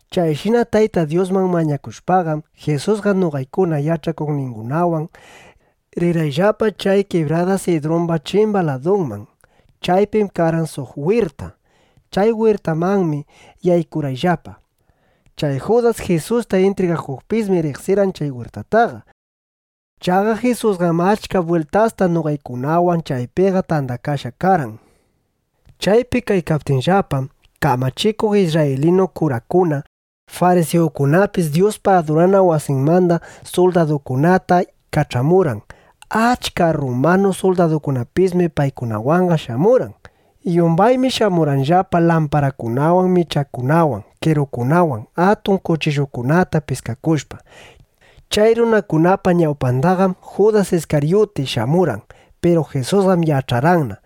Chayshina Tayta Dyusman mañakushpaqam, Jisusqa noqaykuna yach'akuqningunawan rirqayllapa chay kibrada Sidrumba chimba ladunman. Chaypim karqan suq wirta. Chay wirtamanmi yaykurqayllapa. Chay Judas Jisusta intrigakuqpismi riqsirqan chay wirtataqa. Chaqa Jisusqam achka bwiltasta noqaykunawan chaypiqa tandakashqa karqan. Chaypi kaykaptiyllapam, kamachikuq isrraylinu kurakuna, farisiyukunapis Dyuspa adurana wasinmanda suldadukunata kach'amurqan. Achka rrumanu suldadukunapismi paykunawanqa shamurqan. Yumbaymi shamurqanllapa lamparakunawan michakunawan, qerukunata, atun kuchillukunata piskakushpa. Chay runakunapa ñawpandaqam Judas Iskaryuti shamurqan. Piru Jisusqam yach'arqanna: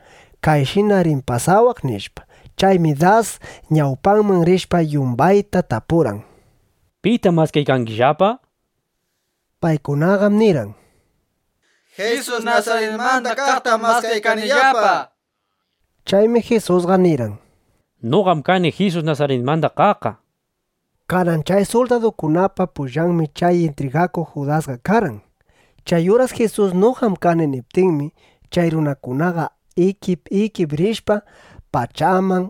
Kayshinam rin pasawaq, nishpa. Chaymi das ñawpaman rishpa, yumbayta tapurqan: —¿Pitam maskaykangillapa? nishpa. Paykunaqam nirqan: —Jisus Nasaritmanda kaqtam maskaykanillapa, nishpa. Chaymi Jisusqa nirqan: —Noqam kani Jisus Nasaritmanda kaqqa, nishpa. Kanan chay suldadukunapa pullanmi chay intrigakuq Judasqa karqan. Chay uras Jisus “Noqam kani” niptinmi, chay runakunaqa ikip ikip rishpa, pachaman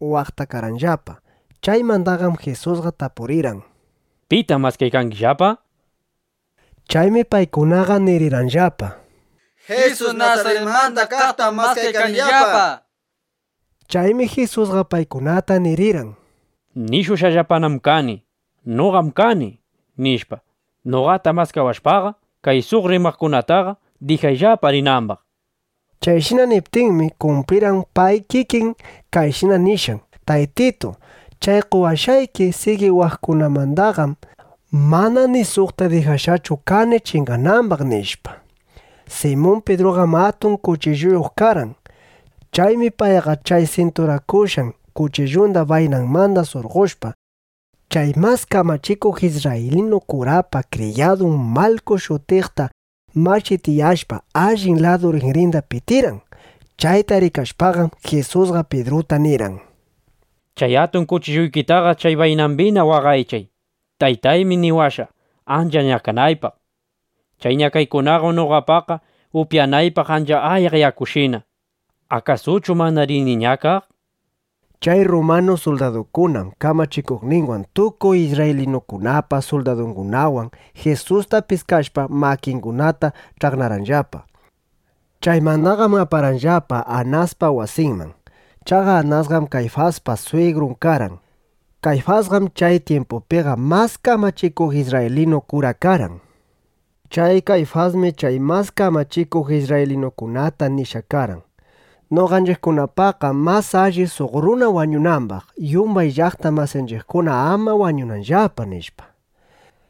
waqtakarqanllapa. Chaymandaqam Jisusqa tapurirqan: —¿Pitam maskaykangillapa? nishpa. Chaymi paykunaqa nirirqanllapa: —Jisus Nasaritmanda kaqtam maskaykanillapa, nishpa. Chaymi Jisusqa paykunata nirirqan: —Nishushqallapanam kani: “Noqam kani”, nishpa. Noqata maskawashpaqa, kay suq runakunataqa dijayllapa rinambaq, nishpa. Chayshina niptinmi, kumplirqan pay kikin kayshina nishqan: “Taytitu, chay qowashqayki sigiwaqkunamandaqam mana ni suqta dijashqachu kani chinganambaq”, nishpa. Simun Pidruqam atun kuchilluyuq karqan. Chaymi payqa chay sinturakushqan kuchillunda baynanmanda surqoshpa, chay mas kamachikuq isrraylinu kurapa kriyadun Malku shutiqta machitiyashpa, allin ladu rinrinda pitirqan. Chayta rikashpaqam, Jisusqa Pidruta nirqan: —Chay atun kuchilluykitaqa chay baynambina waqaychay. Taytaymi niwashqa, ancha ñakanaypaq. Chay ñakaykunaqam noqapaqqa upyanaypaq ancha ayaq yakushina. ¿Akasuchu mana rini ñakaq? nishpa. Chay rrumanu suldadukunam kamachikuqninwan tukuy isrraylinukunapa suldadungunawan Jisusta piskashpa, makingunata ch'aqnarqanllapa. Chaymandaqam aparqanllapa Anaspa wasinman. Chaqa Anasqam Kayfaspa swigrun karqan. Kayfasqam chay tyimpupiqa mas kamachikuq isrraylinu kura karqan. Chay Kayfasmi chay mas kamachikuq isrraylinukunata nishqa karqan: “Noqanchiqkunapaqqam mas alli, suq runa wañunambaq, yumbay llaqta masinchiqkuna ama wañunanllapa”, nishpa.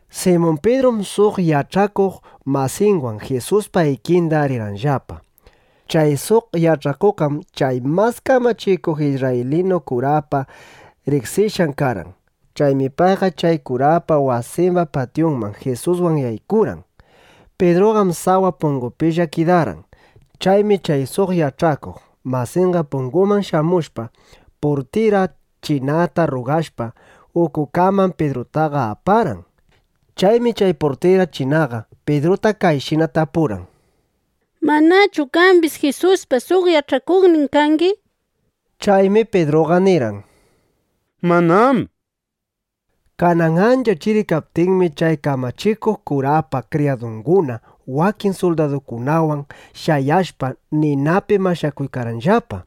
Simun Pidrum suq yach'akuq masinwan Jisuspa ikinda rirqanllapa. Chay suq yach'akuqqam chay mas kamachikuq isrraylinu kurapa riqsishqan karqan. Chaymi payqa chay kurapa wasimba patyunman Jisuswan yaykurqan. Pidruqam sawa pungupilla kidarqan. Chaymi chay suq yach'akuq masinqa punguman shamushpa, purtira chinata rrugashpa, ukukaman Pidrutaqa aparqan. Chaymi chay purtira chinaqa Pidrutaqa kayshina tapurqan: —¿Manachu qambis Jisuspa suq yach'akuqnin kangi? nishpa. Chaymi Pidruqa nirqan: —Manám, nishpa. Kanan ancha chiri kaptinmi, chay kamachikuq kurapa kriyadunguna, wakin suldadukunawan shayashpa, ninapi mashakuykarqanllapa.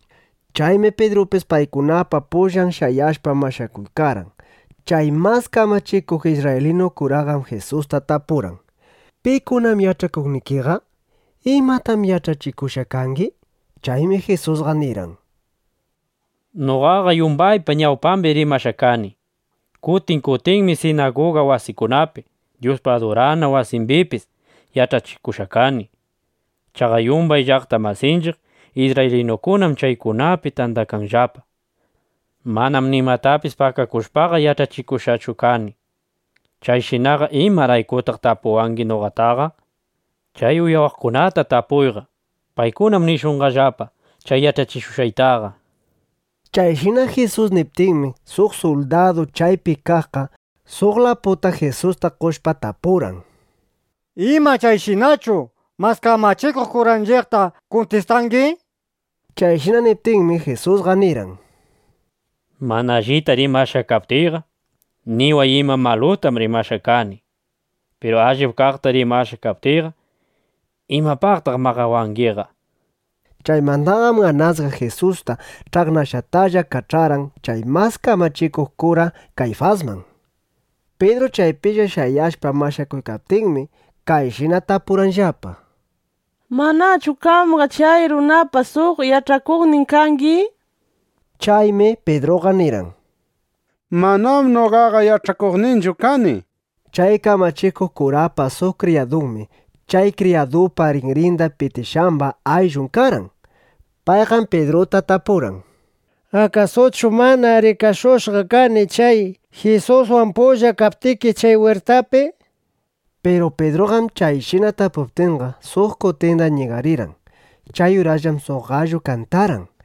Chaymi Pidrupis paykunapa pullan shayashpa, mashakuykarqan. Chay mas kamachikuq isrraylinu kuraqam Jisusta tapurqan: —¿Pikunam yach'akuqnikiqa? ¿Imatam yach'achikushqa kangi? Chaymi Jisusqa nirqan: —Noqaqam yumbaypa ñawpambi rimashqa kani. Kutin kutinmi sinaguga wasikunapi, Dyuspa adurana wasimbipis yach'achikushqa kani. Chaqa yumbay llaqta masinchiq isrraylinukunam chaykunapi tandakanllapa. Manam nimatapis pakakushpaqa, yach'achikushqachu kani. Chayshinaqa ¿imaraykutaq tapuwangi noqataqa? Chay uyawaqkunata tapuyqa. Paykunam nishunqallapa chay yach'achikushqaytaqa, nishpa. Chayshina Jisus niptinmi, suq suldadu chaypi kaqqa suq laputa Jisusta qoshpa, tapurqan: —¿Ima, chayshinachu mas kamachikuq kuranchiqta kuntistangi? nishpa. Chayshina niptinmi, Jisusqa nirqan: —Mana allita rimashqa kaptiyqa, niway ima malutam rimashqa kani, nishpa. Piru allip kaqta rimashqa kaptiyqa, ¿imapaqtaq maqawangiqa? nishpa. Chaymandaqam Anasqa Jisusta ch'aqnashqatalla kach'arqan chay mas kamachikuq kura Kayfasman. Pidru chaypilla shayashpa mashakuykaptinmi, kayshina tapurqanllapa: —¿Manachu qamqa chay runapa suq yach'akuqnin kangi? nishpa. Chaymi Pidruqa nirqan: —Manam noqaqa yach'akuqninchu kani, nishpa. Chay kamachikuq kurapa suq kriyadunmi, chay kriyadupa rinrinda pitishqamba ayllun karqan. Payqam Pidruta tapurqan: —¿Akasuchu mana rikashushqa kani chay Jisuswan pulla kaptiki chay wirtapi? nishpa. Piru Pidruqam chayshina tapuptinqa, suq kutinda ñigarirqan. Chay urasllam suq gallu kantarqan.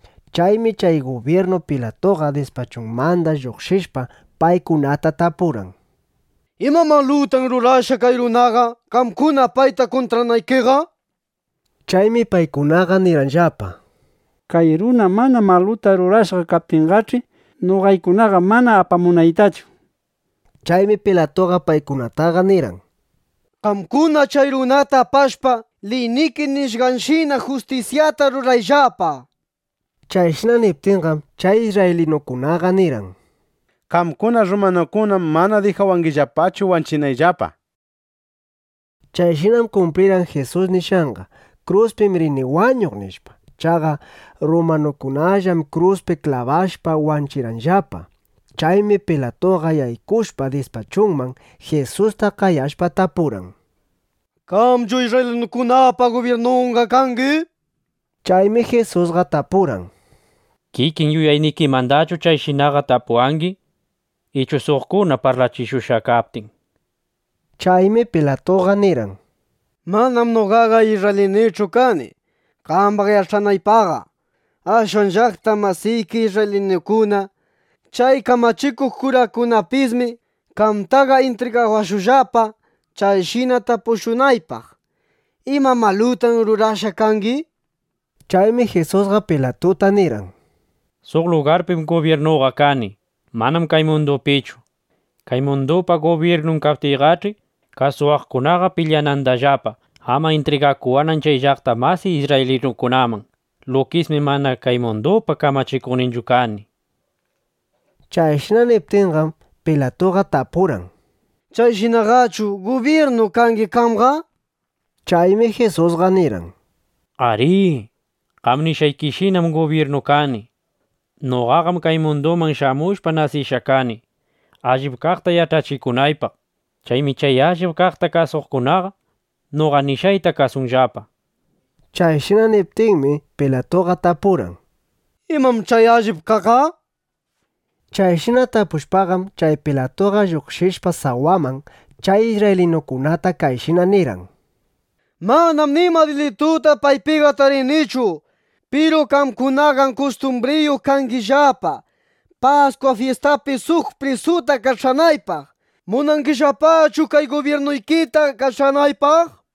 Chaymi chay gubyirnu Pilatuqa dispachunmanda lluqshishpa, paykunata tapurqan: —¿Ima malutam rurashqa kay runaqa, qamkuna payta kuntranaykiqa? nishpa. Chaymi paykunaqa nirqanllapa: —Kay runa mana maluta rurashqa kaptinqach'i, noqaykunaqa mana apamunaytachu, nishpa. Chaymi Pilatuqa paykunataqa nirqan: —Qamkuna chay runata apashpa, liyniki nishqanshina justisyata rurayllapa, nishpa. Chayshina niptinqam, chay isrraylinukunaqa nirqan: —Qamkuna rrumanukunam mana dijawangillapachu wanchinayllapa, nishpa. Chayshinam kumplirqan Jisus nishqanqa: “Kruspim rini wañuq”, nishpa. (Chaqa rrumanukunallam kruspi klabashpa wanchirqanllapa.) Chaymi Pilatuqa yaykushpa dispachunman, Jisusta qayashpa, tapurqan: —¿Qamchu isrraylinukunapa gubyirnunqa kangi? nishpa. Chaymi Jisusqa tapurqan: —¿Kikin yuyaynikimandachu kayshinaqa tapuwangi, ichu suqkuna parlachishushqa kaptin? nishpa. Chaymi Pilatuqa nirqan: —Manam noqaqa isrraylinuchu kani, qambaq yach'anaypaqqa. Ashwan llaqta masiki isrraylinukuna, chay kamachikuq kurakunapismi qamtaqa intrigawashqallapa, kayshina tapushunaypaq: ¿Ima malutam rurashqa kangi? nishpa. Chaymi Jisusqa Pilatuta nirqan: —Suq lugarpim gubyirnuqa kani. Manam kay mundupichu. Kay mundupa gubyirnun kaptiyqach'i, kasuwaqkunaqa pilyanandallapa, ama intrigakuwanan chay llaqta masiy isrraylinukunaman. Lukismi mana kay mundupa kamachikuqninchu kani, nishpa. Chayshina niptinqam, Pilatuqa tapurqan: —¿Chayshinaqachu gubyirnu kangi qamqa? nishpa. Chaymi Jisusqa nirqan: —Arí, qam nishqaykishinam gubyirnu kani. Noqaqam kay munduman shamushpa, nasishqa kani, allip kaqta yach'achikunaypaq. Chaymi chay allip kaqta kasuqkunaqa noqa nishqayta kasunllapa, nishpa. Chayshina niptinmi, Pilatuqa tapurqan: —¿Imam chay allip kaqqa? nishpa. Chayshina tapushpaqam, chay Pilatuqa lluqshishpa sawaman, chay isrraylinukunata kayshina nirqan: —Manam nima dilituta paypiqa tarinichu. Piru qamkunaqam kustumbriyuq kangillapa, Paskwa fyistapi suq prisuta kach'anaypaq. ¿Munangillapachu kay gubyirnuykita kach'anaypaq? nishpa.